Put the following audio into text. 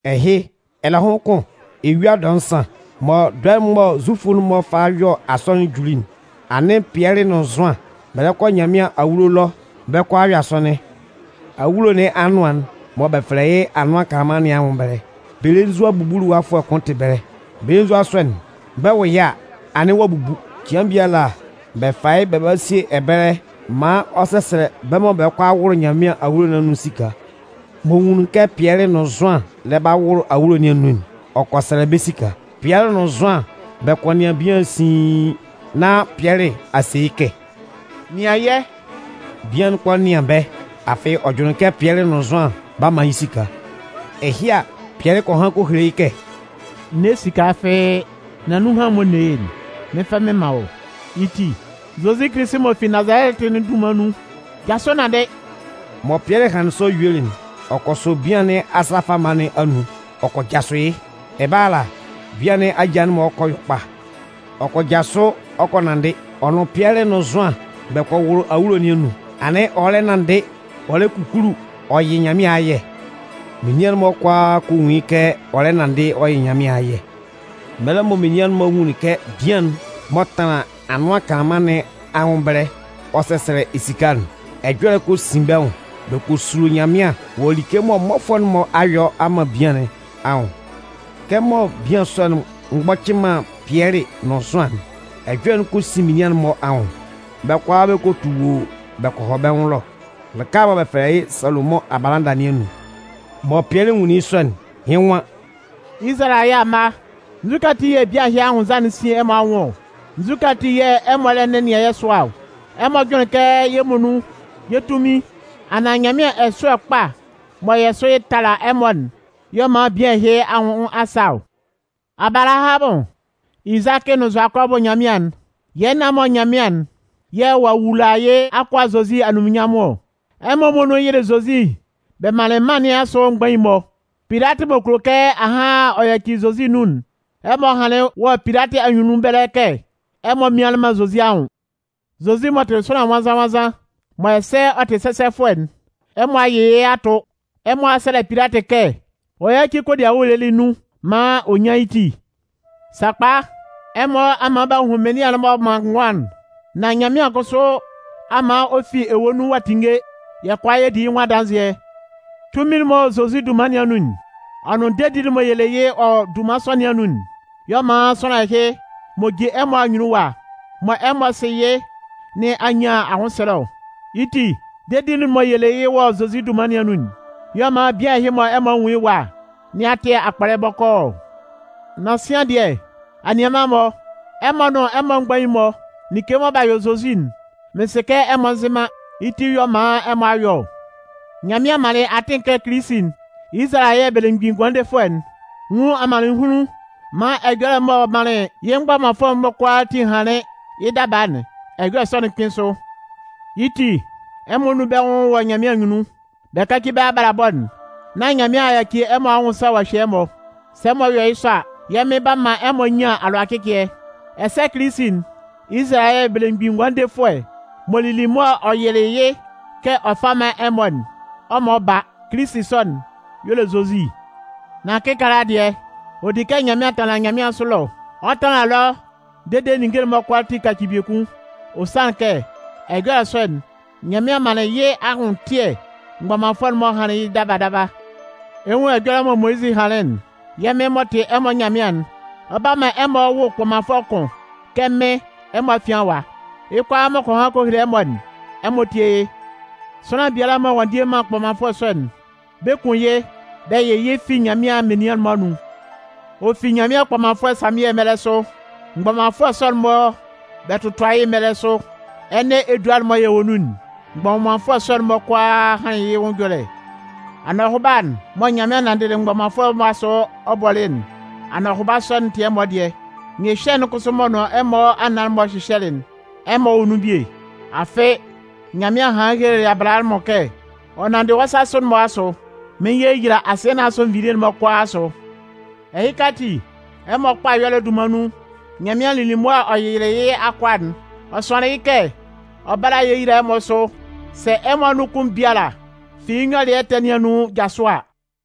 Ɛhɩ, ɛlɛhʋn kʋn, eyua dɔɛ nsan, mɔ dɔɛ'n mɔ Zufʋ'n-mɔ fa yɔ asɔnɩn'n juli'n, anɩn Pɩɛlɩ nʋn Zʋan, bɛ lɛ kɔ Nyanmɩan awulo ɛlɔ bɛ 'kɔ a yɔ asɔnɩn. Awulo nɩn anʋan'n mɔ bɛ fɛlɛ yɩ́ “Anʋan Kanlanman” nɩn anwʋn ɛbɛlɛ, belenzua bubuluwafʋɛ kʋn tɩ ɛbɛlɛ. Belenzua sɔ'n, bɛ 'wʋ yɩ́ a, anɩn ɔ'a bubu. Cɩan biala, bɛ fa yɩ́ bɛ ba sie yɩ́ ɛbɛlɛ, maan ɔ sɛsɛlɛ bɛ́ mɔ bɛ lɛ kɔ a wʋlʋ Nyanmɩan awulo nɩn anun nɩn esika. M'ɔ nwunlin kɛ Pɩɛlɩ nʋn Zʋan lɛ ba wʋlʋ awulo nɩn anun'n, ɔ kɔ sɛlɛ bɛ́ esika. Pɩɛlɩ nʋn Zʋan bɛ kɔ nɩan bian'n siin, nán Pɩɛlɩ a se yɩ́ kɛ: “Nɩan yɛ́!” Bian'n kɔ nɩan bɛ́, afɩ ɔ jʋnlɩn kɛ Pɩɛlɩ nʋn Zʋan 'ba man yɩ́ esika. Ɛhɩ a, Pɩɛlɩ kɔ han kɔ hele yɩ́ kɛ: “N ne esika fɩ́ɩ́. Nan nunhan mɔ n ne yɩ́'n, mɩn 'fa mɩn man wɔ́. Yɩ́ ti, Zozi Kilisi m'ɔ fi Nazalɛtɩ'n dunman nun, jasʋ nanndɩ!” Mɔ Pɩɛlɩ hanlɩn sɔ yuelɩ'n, ɔ kɔ sɔ bian nɩn asa fama nɩn anun ɔ kɔ jasʋ yɩ́. Ɛbɛlɛ ala, bian nɩn aja'n-mɔ kɔ yɔ kpa. Ɔ kɔ jasʋ ɔ kɔ nanndɩ. Ɔ nʋn Pɩɛlɩ nʋn Zʋan bɛ kɔ wʋlʋ awulo nɩn anun, anɩn ɔ lɛ nanndɩ ɔ lɛ kukulu ɔ yɩ Nyanmɩan ayɛ. Menian'n-mɔ kʋalaa kɔ nwun yɩ́ kɛ ɔ lɛ nanndɩ ɔ yɩ Nyanmɩan ayɛ. Mɛlɛ mɔ menian'n-mɔ nwunlin kɛ bian'n m'ɔ tanlan Anʋan Kanlanman nɩn anwʋn ɛbɛlɛ ɔ sɛsɛlɛ esika'n, ɛjɔlɛ'n kɔ sin bɛ́ nwʋn bɛ kɔ sulo Nyanmɩan wɔ like mɔ mmɔfʋɛ'n-mɔ a yɔ a man bian nɩn anwʋn. Kɛmɔ bian sɔ'n mgbɔcɩ man Pɩɛlɩ nʋn Zʋan'n, ɛjɔlɛ'n kɔ sin menian'n-mɔ anwʋn. Bɛ́ kʋalaa bɛ kɔ tu woo bɛ kɔ hɔ bɛ́ nwʋn ɛlɔ lɩka'n mɔ bɛ fɛlɛ yɩ́ “Salomʋn Abalada” nɩn anun. Mɔ Pɩɛlɩ nwunlin yɩ́ sɔ'n, yɩ́ nwan: “Izalayɛ amma, nzukɛ ati yɛ̂ bian ɛhɩ anwʋnnza'n sin ɛmɔ anwʋn ɔ? Nzukɛ ati yɛ̂ ɛmɔ lɛ nɛnɩan yɛ́ sʋa ɔ? Ɛmɔ jʋnlɩn kɛ yɛ́ muonun yɛ́ tunmɩn anaan Nyanmɩan ɛsʋ́ɛ kpa mɔ yɛ sʋ tala ɛmɔ'n y'ɔ man bian ɛhɩ anwʋn a sa ɔ? Abalahamʋn, Izakɩ nʋn Zʋakɔbʋ Nyanmɩan'n, yɛ́ nan-mɔ Nyanmɩan'n yɛ̂ ɔ'a wula yɩ́ akʋa Zozi anunminnyanmʋn ɔ. Ɛmɔ muonun yɩlɩ Zozi bɛ manlɩn mân nɩn asʋ mgbain'n-mɔ. Pilatɩ m'ɔ kulo kɛ ahan ɔ yaci Zozi nun'n, ɛmɔ hanlɩn wɔ Pilatɩ anyunnun ɛbɛlɛ kɛ ɛmɔ mmianlɩn man Zozi anwʋn. Zozi m'ɔ tɩ sʋanlan nwannzan-nwannzan, mɔ ɛsɛ ɔ tɩ sɛsɛfʋɛ'n, ɛmɔ a yɩ yɩ́ a tʋ. Ɛmɔ a sɛlɛ Pilatɩ kɛ ɔ yáci kodiawu'n lɩlɩ nun maan ɔ nyán yɩ́ ti. Sakpa, ɛmɔ a man b'a hun Mɩnlɩan'n m'ɔ man ngʋan'n. Nan Nyanmɩan kʋsʋ a man ɔ fi ewue nun ɔ'a tinnge, yɛ́ kʋalaa yɛ di yɩ́ nwʋn adanzɩɛ. Tunmin'n m'ɔ wɔ Zozi dunman nɩn anun'n, ɔ nʋn dedi'n mɔ yɛ le yɩ́ wɔ dunman sɔ nɩn anun'n, y'ɔ man sʋanlan ɛhɩ m'ɔ jin ɛmɔ anyunnun ɛwa, mɔ ɛmɔ sɩ yɩ́ nɩn a nyan anwʋnsɛlɛ ɔ. Yɩ́ ti, dedi'n mɔ yɛ le yɩ́ wɔ Zozi dunman nɩn anun'n, y'ɔ man bian ɛhɩ mɔ ɛmɔ nwun yɩ́ ɛwa nɩn a tɩ akpɔlɛ bɔkɔɔ ɔ. “Nan sian dɩɛ, anianman-mɔ, ɛmɔ nʋn ɛmɔ mgbain'n-mɔ like mɔ b'a yɔ Zozi'n, mɩn sɩ kɛ ɛmɔ nzɩ man, yɩ́ ti y'ɔ man ɛmɔ a yɔ ɔ. Nyanmɩan manlɩn atɩn kɛ Kilisi'n, Izalayɛ Belemgbin Ngʋandefʋɛ'n, nwún amannɩnhunlun maan ɛjɔlɛ m'ɔ manlɩn yɩ́ mgbɔmanfʋɛ'n-mɔ kʋalaatin hanlɩn yɩ́ daba'n, ɛjɔlɛ sɔ'n kpɩ́n sʋ. Yɩ́ ti, ɛmɔ nún bɛ́ nwʋn wɔ Nyanmɩan anyunnun, bɛ káci bɛ́ abalabɔ'n, nán Nyanmɩan a yaci ɛmɔ anwʋn sa ɔ'a hye ɛmɔ. Sɛ ɛmɔ yɔ yɩ́ sɔ a, yɛ́ Mɩn 'ba man ɛmɔ nyan alʋacɩcɩɛ. Ɛsɛ Kilisi'n, Izalayɛ Belemgbin Ngʋandefʋɛ m'ɔ lili mʋa ɔ yɩlɩ yɩ́ kɛ ɔ 'fa man ɛmɔ'n, ɔ 'man ɔ ba. Kilisi sɔ'n y'ɔ le Zozi. “Nan kɩkaala dɩɛ, ɔ di kɛ Zozi tanlan nyanmɩansʋ ɛlɔ. Ɔ 'tanlan ɛlɔ dede ninnge'n-mɔ kʋalaatin kaci biekun. Ɔ sanlɩn kɛ ɛjɔlɛ sɔ'n, Nyanmɩan manlɩn yɩ́ anwʋntɩɛ mgbɔmanfʋɛ'n-mɔ hanlɩn yɩ́ daba daba. Ɛ 'nwun ɛjɔlɛ mɔ Moyizɩ hanlɩn'n: Yɛ́ Mɩn m'ɔ tɩ ɛmɔ Nyanmɩan'n, ɔ 'ba man bɛ wʋ kpɔmanfʋɛ kʋn kɛ mɩ́n ɛmɔ afian ɛwa. Yɩ́ kʋalaa m'ɔ kɔ han kɔ hele ɛmɔ'n, ɛmɔ tíe yɩ́. Sʋanlan biala mɔ ɔ'a ndie man kpɔmanfʋɛ sɔ'n, bɛ 'kun yɩ́ bɛ yɩ yɩ́ fi Nyanmɩan menian'n-mɔ anun. “Ɔ fi Nyanmɩan kpɔmanfʋɛ Samiɛ mɛlɛ sʋ, mgbɔmanfʋɛ'n-mɔ mɔ bɛ tɔtʋa yɩ́'n mɛlɛ sʋ, ɛnɛ edua'n mɔ yɛ wɔ nun'n, mgbɔmanfʋɛ sɔ'n-mɔ kʋalaa hanlɩn yɩ́ nwʋn ɛjɔlɛ. Anɔhʋba'n mɔ Nyanmɩan nanndɩlɩ mgbɔmanfʋɛ'n-mɔ asʋ ɔ bɔlɩ'n, anɔhʋba sɔ'n tɩ ɛmɔ dɩɛ. Nyɩhyɛ'n kʋsʋ m'ɔ nʋn ɛmɔ anan-mɔ hyɩhyɛlɩ'n, ɛmɔ wɔ nun bie. Afɩ, Nyanmɩan hanlɩn helelɩ Abalahamʋn kɛ: Ɔ nanndɩ wɔ́ sasʋ'n-mɔ asʋ, mɩn 'yeyila asɩɛ nɩn asʋ nvilie'n-mɔ kʋalaa asʋ. Ɛhɩka ati, ɛmɔ kpa ɛyɔlɛ dunman nun, Nyanmɩan lili mʋa ɔ yɩlɩ yɩ́ akʋa'n, ɔ sʋanlɩn yɩ́ kɛ ɔ bála a yeyila ɛmɔ sʋ, sɛ ɛmɔ anun kʋn biala fi yɩ́ nyɔlɩɛ ɛtɛ nɩn anun jasʋ a.”